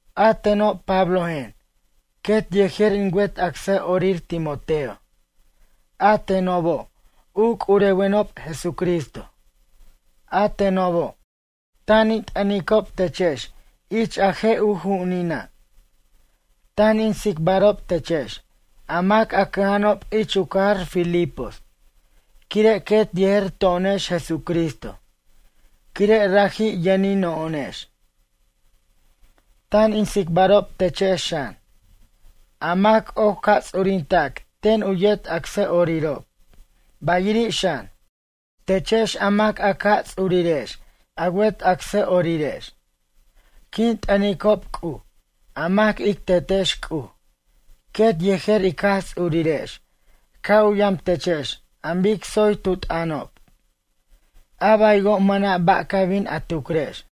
A teno' Pablojen, quet yejer in wet acsʌ'orir Timoteo, a tenobo', u c'urewenob Jesucristo. A tenobo', tan in t'ʌnicob techex ich a je' u ju'unina'. Tan in tsicbarob techex, a mac a cʌja'anob ich u cajar Filipos quire' quet yejer to'onex Jesucristo quire' raji' yʌnino'onex. Tan in tsicbarob techex xan, a mac oc ca' ts'urinta'c ten u yet acsʌ'orirob bayiri' xan, techex a mac a ca' ts'urirex a wet acsʌ'orirex. Quin t'ʌnicob C'uj, a mac ic Tetex C'uj, quet yejer ij Jaj Ts'urirex ca' u yam techex an bic tsoy tu t'ʌnob, a baywo' mʌna' ba' ca bin a tucrex.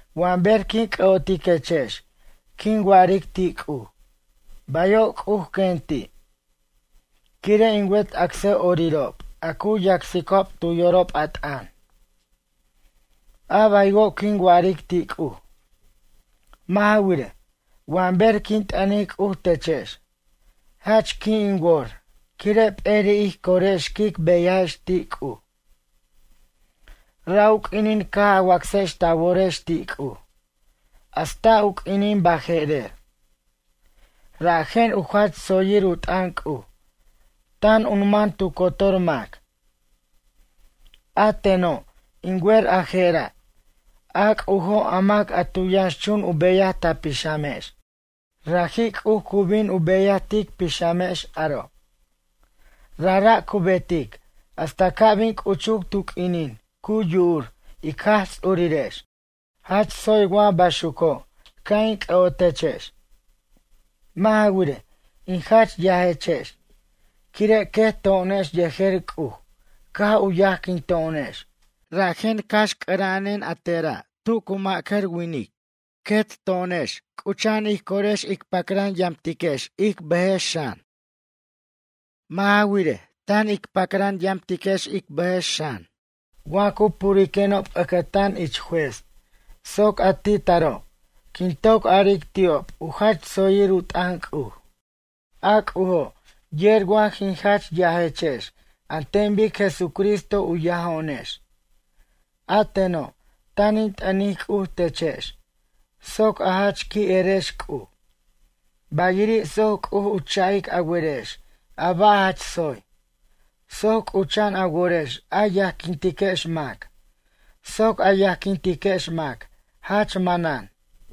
Wa ber quin c'ʌ'otiquechex quin wa'aric ti' C'uj: “Bayo' C'uj, quen ti', quire' in wet acsʌ'orirob a cu yacsicob tu yorob a t'ʌn.” A baywo' quin wa'aric ti' C'uj. Mʌ' ja wirej, wa ber quin t'ʌnic C'uj techex, jach qui' in wor quire' p'eri' ij corex quic beyajex ti' C'uj. Ra' u q'uinin caj a wacsex ta worex ti' C'uj hasta u q'uinin baje'rer. Rajen, u jach tsoyir u t'ʌn C'uj tan u man tu cotor mac. A teno', in wer a je'ra', a C'ujo' a mac a tu yʌnxchun u beyaj ta pixamex, raji' C'uj cu bin u beyaj tic pixamex aro'. Rajra' cu betic hasta ca' bin c'uchuc tu q'uinin cu yu'ur ic Jaj Ts'urirex. Jach tsoy wa baxuco' ca' in c'ʌ'otechex. Mʌ' ja wirej, in jach yajechex, quire' quet to'onex yejer C'uj caj u yajquino'onex rajen cax c'ʌra'anen a tera' tu cu ma'cʌr winic, quet to'onex c'ucha'an ij corex ic pacran yamtiquex ic bʌjex xan. Mʌ' ja wirej, tan ic pacraj yamtiquex ic bʌjex xan wa cu puriquenob ʌcʌtan ich juez soc a ti' taro' quin toc aric ti'ob u jach tsoyir u t'ʌn C'uj. A C'ujo' yer wa jin jach yajechex an ten bic Jesucristo u yajo'onex. A teno' tan in t'ʌnic C'uj techex soc a jach qui' erex C'uj, bayiri' soc C'uj u cha'ic a werex a ba' jach tsoy, soc c'ucha'an a worex a yajquintiquex mac soc a yajquintiquex mac jach manan.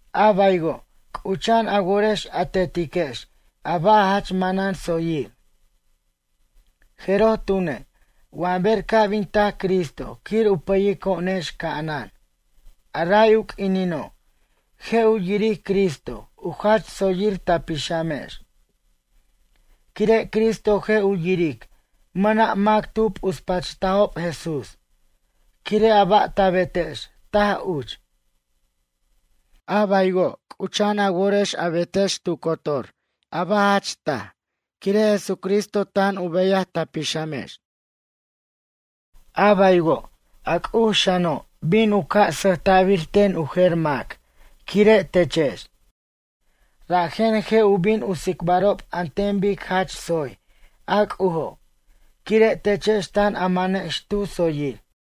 A baywo' c'ucha'an a worex a tetiquex a ba' jach manan tsoyir. Jeroj tune', wa ber ca' bin tac Cristo quir u pʌyico'onex ca'anan, a ray u q'uinino, je' u yiric Cristo u jach tsoyir ta pixamex. Quire' Cristo je' u yiric mʌna' mac tu p'uspachtajob Jesús quire' a ba' ta betex taj uch. A baywo' c'ucha'an a worex a betex tu cotor a ba' jach taj quire' Jesucristo tan u beyaj ta pixamex. A baywo', a C'uj xano' bin u ca' sʌjta'bir ten u jer mac quire' techex, rajen je' u bin u tsicbarob an ten bic jach tsoy a C'ujo' quire' techex tan a manex tu tsoyir.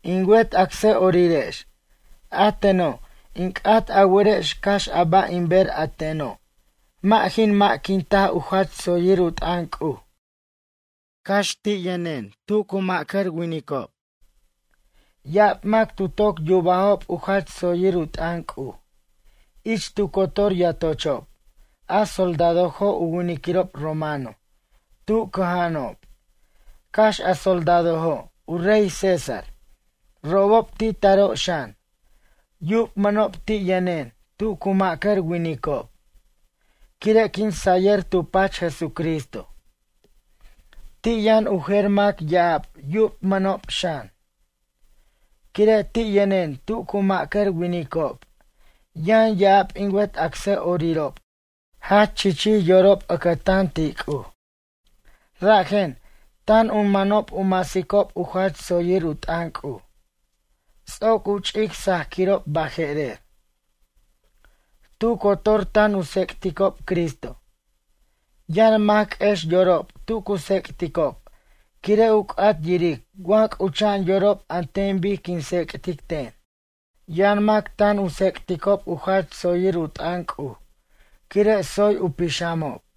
In wet acsʌ'orirex, a teno' in c'at a werex cax a ba' in ber a teno' mʌ' jin mʌ'quintaj u jach tsoyir u t'ʌn C'uj cax ti' yʌnena' tu cu ma'cʌr winicob. Ya'ab mac tu toc yubajob u jach tsoyir u t'ʌn C'uj. Ich tu cotor yatochob a soldadojo' u winiquirob romano tu caja'anob, cax a soldadojo' u rey César, robob ti taro' xan, yubmʌnob ti' yʌnen tu cu ma'cʌr winicob quire' quin sayʌr tu pach Jesucristo. Ti' yʌn u jer mac ya'ab yubmʌnob xan. Quire' ti' yʌnen tu cu ma'cʌr winicob yʌn ya'ab in wet acsʌ'orirob jach chichij yorob ʌcʌtan ti' C'uj. Rajen, tan u manob u masicob u jach tsoyir u t'ʌn C'uj. Ts'oc u ch'ic sajquirob baje'rer. Tu cotor tan u tsec'ticob Cristo. Yʌn mac q'uex yorob tu cu tsec'ticob quire' u c'at yiric wa c'ucha'an yorob an ten bic quin tsec'tic ten. Yʌn mac tan u tsec'ticob u jach tsoyir u t'ʌn C'uj quire' tsoy u pixamob.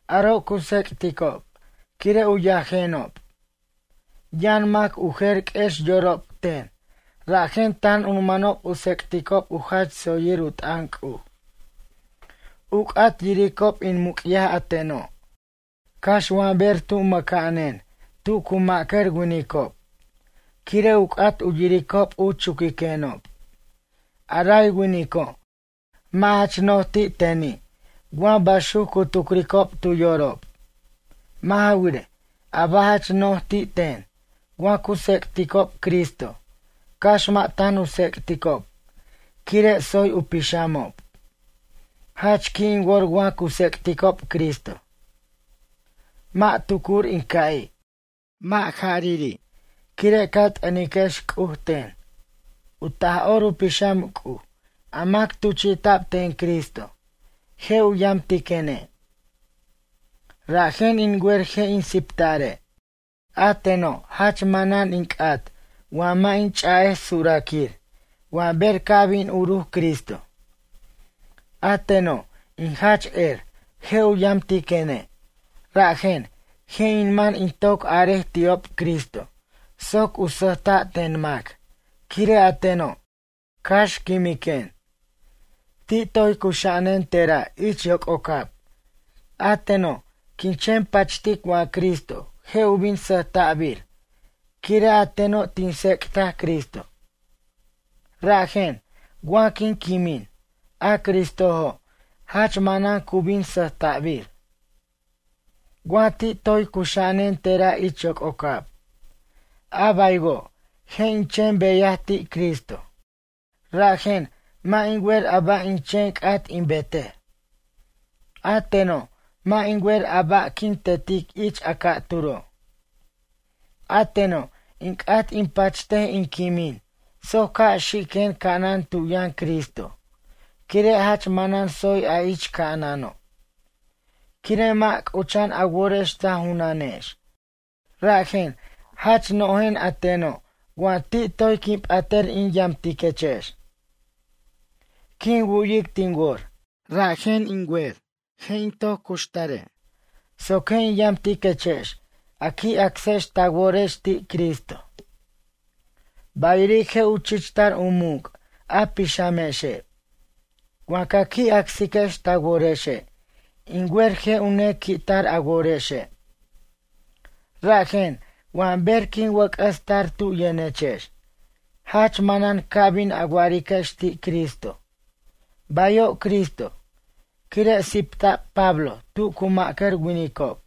Aro' cu tsec'ticob quire' u yajenob. Yʌn mac u jer q'uex yorob ten rajen tan u manob u tsec'ticob u jach tsoyir u t'ʌn C'uj. U c'at yiricob in muc'yaj a teno', cax wa ber tu mʌca'anen tu cu ma'cʌr winicob quire' u c'at u yiricob u chuquiquenob. A ray winico', mʌ' jach no'j ti' teni' wa baxuc cu tucricob tu yorob. Mʌ' ja wirej, a ba' jach no'j ti' ten wa cu tsec'ticob Cristo, cax mʌ' tan u tsec'ticob quire' tsoy u pixamob. Jach qui' in wor wa cu tsec'ticob Cristo. Mʌ' tucur in ca'i'. Mʌ' jarari', quire' ca t'ʌniquex C'uj ten. U Taj'or u Pixam C'uj, a mac tuchi'ta'b ten Cristo, je' u yamtiquene'. Rajen in wer je' in siptare'. A teno' jach manan in c'at wa mʌ' in ch'a'ej suraquir wa ber ca' bin uruc Cristo. A teno' in jach er, je' u yamtiquene', rajen, je' in man in toc araj ti'ob Cristo soc u sʌjta' ten mac quire' a teno', cax quimiquen. Ti' toy cuxa'anen te'ra' ich yoc'ocab, a teno', quin chen pachtic wa Cristo je' u bin sʌjta'bir quire' a teno' tin tsec'taj Cristo. Rajen, wa quin quimin, a Cristojo' jach manan cu bin sʌjta'bir. Wa ti' toy cuxa'anen te'ra' ich yoc'ocab, a baywo' je' in chen beyaj ti' Cristo. Rajen, mʌ' in wer a ba' in chen c'at in betej. A teno', mʌ' in wer a ba' quin tetic ich a ca'turo'. A teno' in c'at in pachtej in quimin soc ca' xiquen ca'anan tu yʌn Cristo, quire' jach manan tsoy a ich ca'anano'. Quire' mʌ' c'ucha'an a worex ta junanex, rajen, jach nojen a teno' wa ti' toy quin p'atʌr in yamtiquechex. Quin wu'yic tin wor, rajen in wer je' in toc cuxtare' soc je' in yamtiquechex a qui' acsex ta worex ti' Cristo. Bayiri' je' u chichtar u muc' a pixamexe'. Wa ca qui' acsiquex ta worexe', in wer je' u nequi'tar a worexe'. Rajen, wa ber quin wʌc'ʌs tar tu yʌnechex, jach manan ca bin a wa'ariquex ti' Cristo: “Bayo' Cristo, quire' sipta'b Pablo tu cu ma'cʌr winicob.”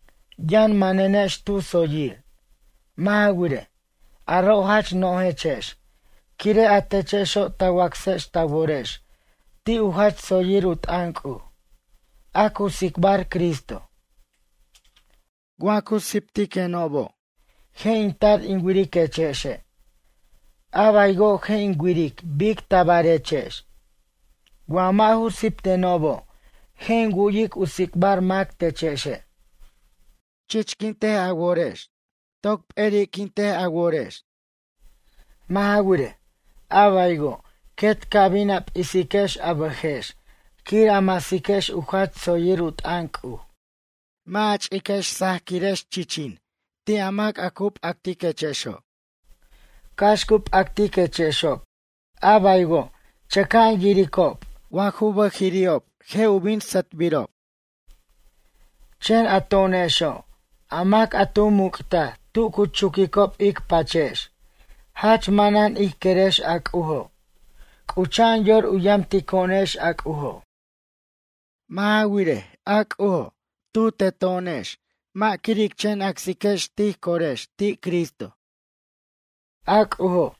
Yʌn manenex tu tsoyir. Mʌ' ja wirej, aro' jach nojechex quire' a techexo' ta wacsex ta worex ti' u jach tsoyir u t'ʌn C'uj, a cu tsicbar Cristo. Wa cu siptiquenobo' je' in tar in wiriquechexe', a baywo' je' in wiric bic tabarechex. Wa mʌ' ju siptenobo' je' in wu'yic u tsicbar mac techexe'. Chichquint a worex. Toc p'eri'quint ja worex. Mʌ' ja wirej, a baywo' quet ca bin a p'isiquex a bʌjex quir a masiquex u jach tsoyir u t'ʌn C'uj. Mʌ' a ch'iquex sajquirechex chichin ti' a mac a cu p'actiquechexo'. Cax cu p'actiquechexob, a baywo' chʌca'an yiricob wa ju bʌjiri'ob je' u bin sʌtbirob. Chen a to'onexo' a mac a tu muc'taj tu cu chuquicob ic pachex, jach manan ij querex a C'ujo' c'ucha'an yor u yamtico'onex a C'ujo'. Mʌ' ja wirej, a C'ujo' tu teto'onex mʌ' quir ic chen acsiquex tij corex ti' Cristo. A C'ujo'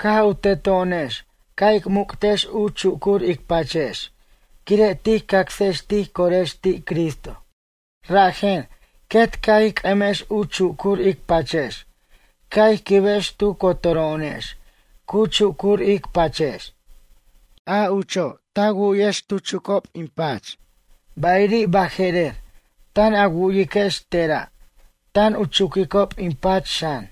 caj u teto'onex ca' ic muc'tex u chucur ic pachex quire' tij cacsex tij corex ti' Cristo. Rajen, quet ca' ij c'ʌmex u chucur ic pachex ca' ij quibex tu cotoro'onex cu chucur ic pachex. A ucho' ta wu'yex tu chucob in pach, bayiri' baje'rer tan a wu'yiquex te'ra' tan u chuquicob in pach xan.